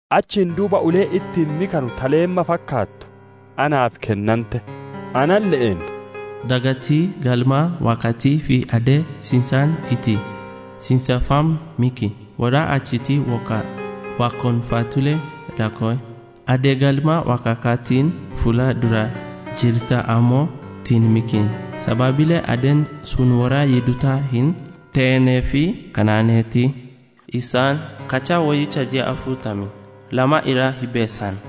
Achiin duuba uleen ittiin mikanu ta leemma fakkaattu naaf kennante; analle'een, «Dhaqiitii Galma Waaqaatii fi addee ciincaan itti ciinceffamu miki; worra achitti waaqonfatulle laakkow. Addee Galma Waaqaatiin fuula dura jirtu ammoo hin mikin. Sababille addeen sun worra Yihudoota hin te'iniif kennanteerti. Isaan qachaa woyyicha ji'a afurtamii lama irra hirbeessan.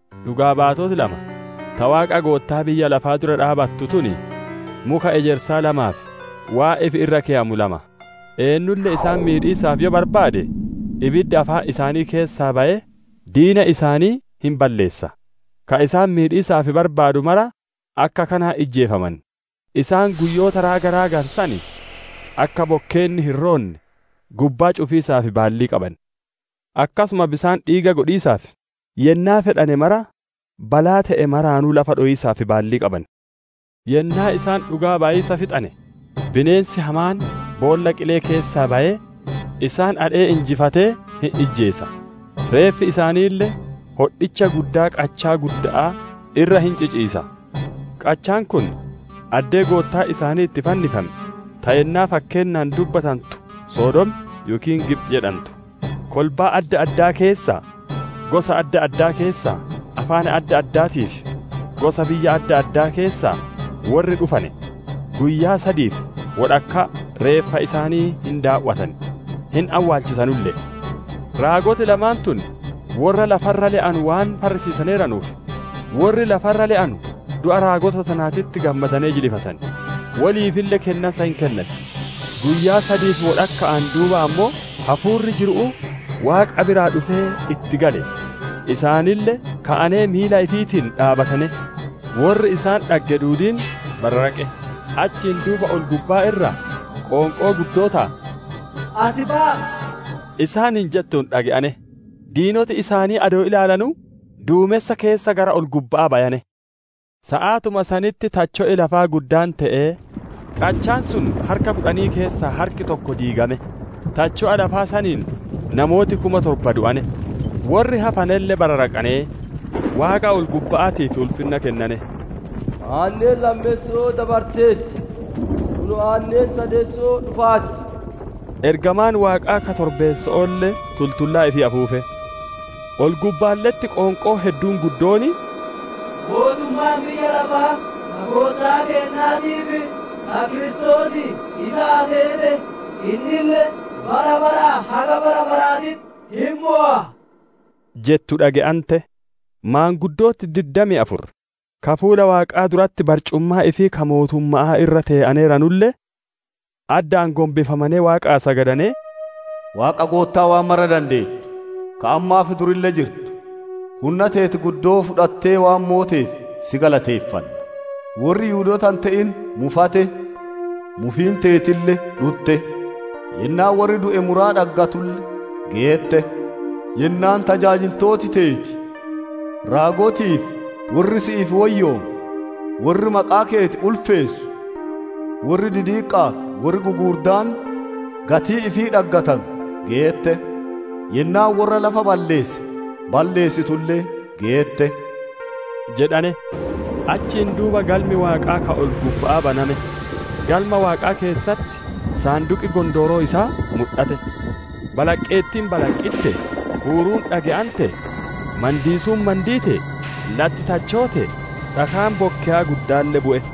Dhugaa baatoti lama, ta Waaqa Goottaa biyya lafaa dura dhaabbattu tun, muka ejersaa lamaa fi waan ifi irra keyamu lama. Eennulle isaan miidhiisaaf yoo barbaade, ibiddi afaan isaanii keessaa bayee diina isaanii hin balleessa; ka isaan miidhiisaaf barbaadu mara akka kanaan ijjeefaman. Isaan guyyoota raaga raaganu san, akka bokkeenni hin roonne gubbaa cufiisaaf baallii qaban; akkasuma bisaan dhiiga godhiisaa fi yennaa fedhane mara balaa te'e maraanuu lafa dhowiisaaf baallii qaban. Yennaa isaan dhugaa bayiisa fixatane, bineensi hamaan boolla qilee keessaa bayee isaan adhee injifatee, hin ijjeesa. Reeffi isaaniille hodhicha guddaa qachaa gudda'aa irra hin ciciisa; qachaan kun addee Goottaan isaanii itti fannifame, ta yennaa fakkeennaan dubbatantu Sodoom yookiin Gibxi jedhantu. Kolbaa adda addaa keessaa, gosa adda addaa keessaa, afaan adda addaatii fi gosa biyya adda addaa keessaa worri dhufane, guyyaa sadii fi wodhakkaa reeffa isaanii hin daaw'atan, hin awwaalchisanulle'e. Raagoti lamaan tun worra lafa irra le'anu waan farrisiisaneeranuuf, worri lafa irra le'anu du'a raagota tanaatitti gammadanee jilifatan; woliifille kennansa hin kennan. Guyyaa sadii fi wodhakka'aan duuba ammoo, hafuurri jiru'uu Waaqa biraa dhufee itti gale; isaanille ka'anee miila ifiitiin dhaabbatane; worri isaan dhagge duudiin bararaqe. Achiin duuba ol-gubbaa irraa qoonqoo guddoo ta, «Asi baya'a!» isaaniin jettu dhage'ane; diinoti isaanii adoo ilaalanu duumensa keessa gara ol-gubba'aa bayane. Saatuma sanitti tacho'i lafaa guddaan te'ee, qachaan sun harka kudhan keessaa harki tokko diigame; tacho'a lafaa saniin namooti kum torba du'ane; worri hafanelle bararaqanee, Waaqa ol-gubba'aatiif ulfinna kennane. Aanneen lammeesso'oo dabarteerti; kunoo aanneen sadeesso'oo dhufaarti. Ergamaan Waaqaa ka torbeesso'oolle tultullaa ifii afuufe. Ol-gubbaalle'etti qoonqoon hedduun guddoon, «Mootummaan biyya lafaa, ta Goottaa keennaatii fi ta Kiristoosii isaa teete; innille bara baraa haga bara baraatitti hin mowa» jettu dhage'ante. Maanguddooti diddamii afur, ka fuula Waaqaa duratti barcumaa ifii ka mootumma'aa irra tee'aneeranulle, addaan gombifamanee Waaqaa sagadanee, «Waaqa Goottaa waan mara dandeettu, ka ammaa fi durille jirtu, hunna teeti guddoo fudhattee waan mooteef, si galateeffanna. Worri Yihudoota hin te'in mufate; mufiin teetille dhutte. Yennaan worri du'e muraa dhaggatulle geette; yennaan tajaajiltooti teeti raagotii fi worri si'iif woyyoome, worri maqaa keeti ulfeessu worri didiqqa'aa fi worri gugurdaan, gatii ifii dhaggatanu geette. Yennaan worra lafa balleesse, balleessitulle geette» jedhane. Achiin duuba Galmi Waaqaa ka ol-gubba'aa baname; Galma Waaqaa keessatti saanduqi Gondooroo isaa mudhate. Balaqqeettiin balaqqittee, huuruun dhage'antee, mandiisuun mandiitee, latti tachootee, dhakaan bokkeyaa guddaalle bu'e.